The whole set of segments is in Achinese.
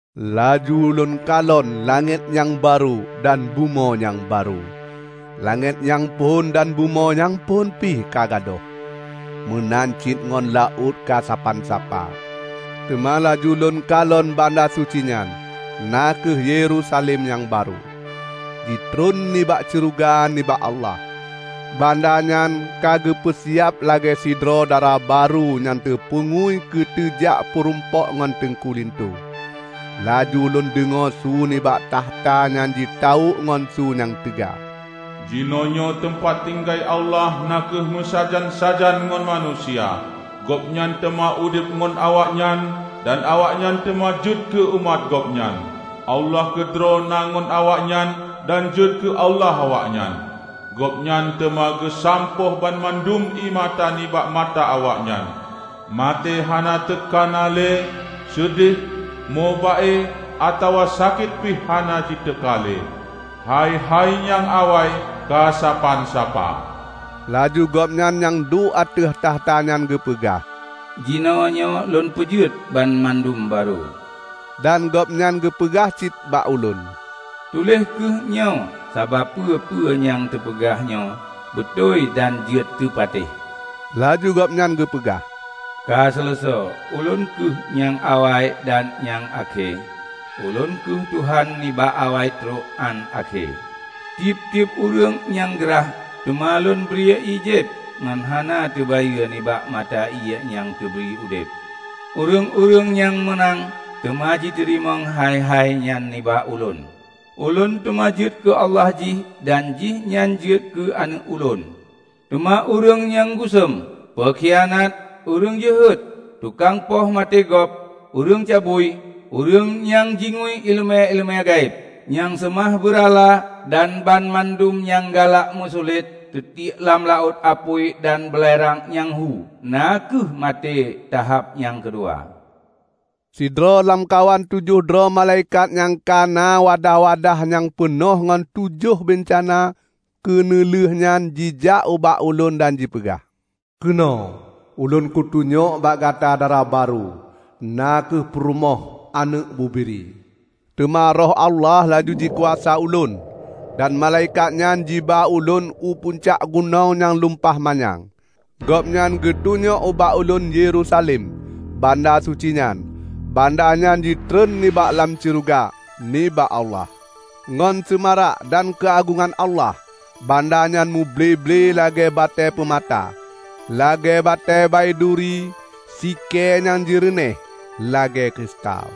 Laju ulôn kalon langét nyang barô dan bumoe nyang barô. Langét nyang phon dan bumoe nyang phon pih ka gadôh, meunan cit ngon laôt ka sapan sapa. Teuma laju lôn kalon banda suci nyan, na kheueh Yerusalem nyang barô, jitreun nibak syeuruga nibak Allah. Banda nyan ka geupeu siab lagée sidroe dara barô nyang teupeungui keu teujak peurumpok ngon teungku linto. Laju lôn deungoe su nibak takhta nyan jitawök ngon su nyang teuga, "Jinoenyoe teumpat tinggai Allah na kheueh meusajan-sajan ngon manusia! Gobnyan teuma udeb ngon awaknyan, dan awaknyan teuma jeuet keu umat Gobnyan. Allah keudroe na ngon awaknyan dan jeuet keu Allah awaknyan. Gobnyan teuma geusampôh banmandum ié mata nibak mata awaknyan. Maté hana teuka na le; seudeh, mo ba-e, atawa sakét pih hana jiteuka lé. Hai-hai nyang awai ka sapan sapa." Laju Gobnyan nyang duek ateueh takhta nyan geupeugah, "Jinoenyoe lôn peujeuet banmandum barô!" Dan Gobnyan geupeugah cit bak ulôn, "Tuléh kheueh nyoe, sabab peue-peue nyang teupeugah nyoe beutôi dan jeuet teupatéh." Laju Gobnyan geupeugah, "Ka seuleusoe! Ulôn kheueh nyang awai dan nyang akhé; Ulôn kheueh Tuhan nibak Awai trok án Akhé. Tieb-tieb ureuëng nyang grah, teuma Lôn bri ié jieb ngon hana teubayeue nibak mata ié nyang teubri udeb. Ureuëng-ureuëng nyang meunang teuma jiteurimong hai-hai nyan nibak Ulôn. Ulôn teuma jeuet keu Allah jih, dan jihnyan jeuet keu aneuëk Ulôn. Teuma ureuëng nyang gusuen, peukhianat, ureuëng jeuhet, tukang poh maté gob, ureuëng cabui, ureuëng nyang jingui iéleumé-iéleumé gaéb, nyang seumah beurala, dan banmandum nyang galak meusulet, teutiek lam laôt apui dan beulerang nyang hu, na kheueh maté tahab nyang keudua." Sidroe lamkawan tujoh droe malaikat nyang ka na wadah-wadah nyang peunoh ngon tujoh beuncana keuneulheueh nyan jijak ubak ulôn dan jipeugah, "Keunoe! Ulôn kutunyok bak gata Dara barô, na kheueh peurumoh Aneuëk Bubiri." Teuma Roh Allah laju jikuasa ulôn, dan malaikat nyan jiba ulôn u pucak gunong nyang lumpah manyang. Gobnyan geutunyok bak ulôn Yerusalem, banda suci nyan, banda nyan jitreun nibak lam syeuruga, nibak Allah, ngon seumarak dan keuagongan Allah. Banda nyan muble-ble lagée batée peumata, lagée batée baiduri sikée nyang jeureunéh lagée kristal.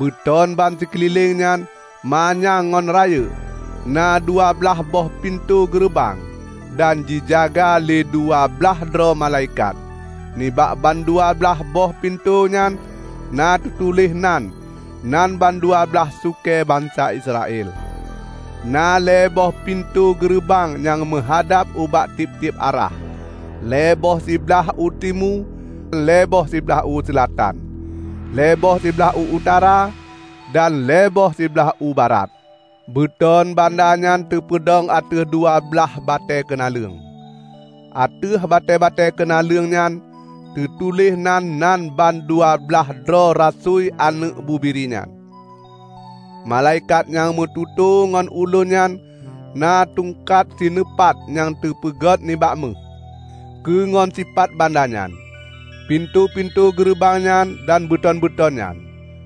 Beuton bansikeulileng nyan manyang ngon rayeuk, na dua blaih boh pintoe geureubang, dan jijaga lé dua blah droe malaikat. Nibak bandua blaih boh pintoe nyan na teutuléh nan-nan bandua blaih sukée bansa Israel. Na lhée boh pintoe geureubang nyang meuhadab ubak tieb-tieb arah: lhée boh siblaih u timu, lhée boh siblaih u seulatan, lhée boh siblaih u utara, dan lhée boh siblaih u barat. Beuton banda nyan teupeudong ateueh dua blaih batée keunaleueng. Ateueh batée-batée keunaleueng nyan teutuléh nan-nan ban dua blaih droe rasui Aneuëk Bubiri nyan. Malaikat nyang meututoe ngon ulôn nyan na tungkat sineupat nyang teupeugét nibak méuh, keu ngon sipat banda nyan, pintoe-pintoe geureubang nyan dan beuton-beuton nyan.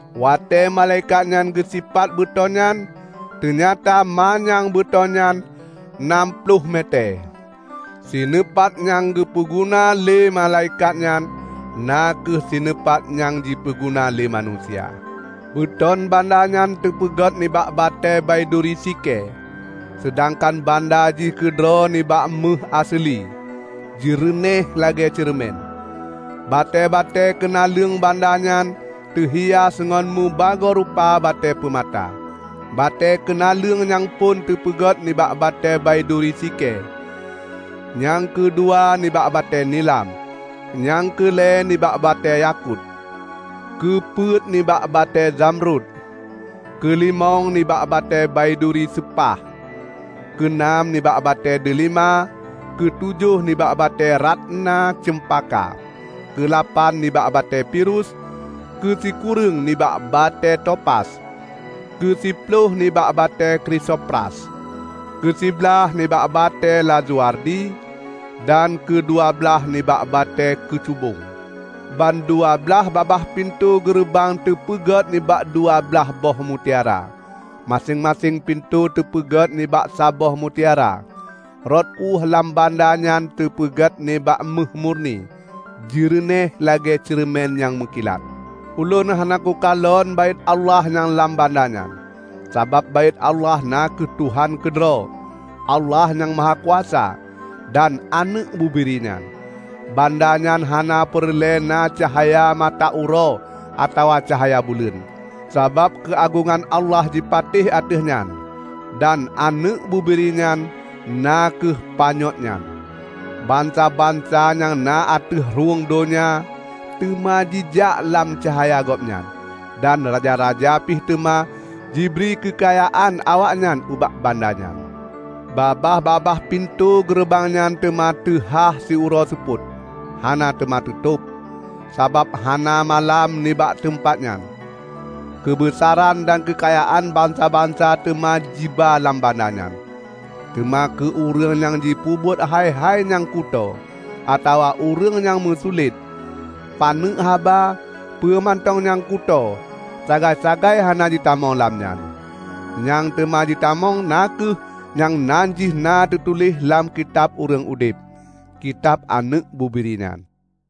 Watée malaikat nyan geusipat beuton nyan, teunyata manyang beuton nyan nam ploh metée. Sineupat nyang geupeu guna lé malaikat nyan na kheueh sineupat nyang jipeuguna lé manusia. Beuton banda nyan teupeugét nibak batée baiduri sikée, seudangkan banda jih keudroe nibak méuh aseuli, jeureunéh lagée ceureumen. Batée-batée keunaleueng banda nyan teuhias ngon mubagoe rupa batée peumata. Batée keunaleueng nyang phon teupeugét nibak batée baiduri sikée, nyang keudua nibak batée nilam, nyang keu lhée nibak batée yakut, keu peuet nibak batée zamrut, keulimong nibak batée baiduri seupah, keu nam nibak batée deulima, keu tujoh nibak batée ratna ceumpaka, keu lapan nibak batée pirus, keu sikureueng nibak batée topas, keu siploh nibak batée krisopras, keu siblaih nibak batée lazuardi, dan keudua blaih nibak batée keucubong. Ban dua blaih babah pintoe geureubang teupeugét nibak dua blaih boh mutiara, maséng-maséng pintoe teupeuget nibak saboh mutiara. Rot ueh lam banda nyan teupeugét nibak méuh murni, jeureunéh lagée ceureumen nyang meukilat. Ulôn hana kukalon Baét Allah nyang lam banda nyan, sabab Baét Allah na kheueh Tuhan keudroe, Allah Nyang Mahakuasa, dan Aneuëk Bubiri nyan. Banda nyan hana peureulée na cahya mata uroe atawa caya buleuen, sabab keuagongan Allah jipatéh ateueh nyan, dan Aneuëk Bubiri nyan na kheueh panyöt nyan. Bansa-bansa nyang na ateueh rhueng donya teuma jijak lam cahya gobnyan, dan raja-raja pih teuma jibri keukayaan awaknyan ubak banda nyan. Babah-babah pintoe geureubang nyan teuma teuhah siuroe seupôt; hana teuma teutôb, sabab hana malam nibak teumpat nyan. Keubeusaran dan keukayaan bansa-bansa teuma jiba lam banda nyan. Teuma keu ureuëng nyang jipeubuet hai-hai nyang kutoe, atawa ureuëng nyang meusulet -- paneuk haba peue mantong nyang kutoe, sagai-sagai hana jitamong lam nyan. Nyang teuma jitamong na kheueh nyang nan jih na teutuléh lam Kitab Ureuëng Udeb, kitab Aneuëk Bubiri nyan.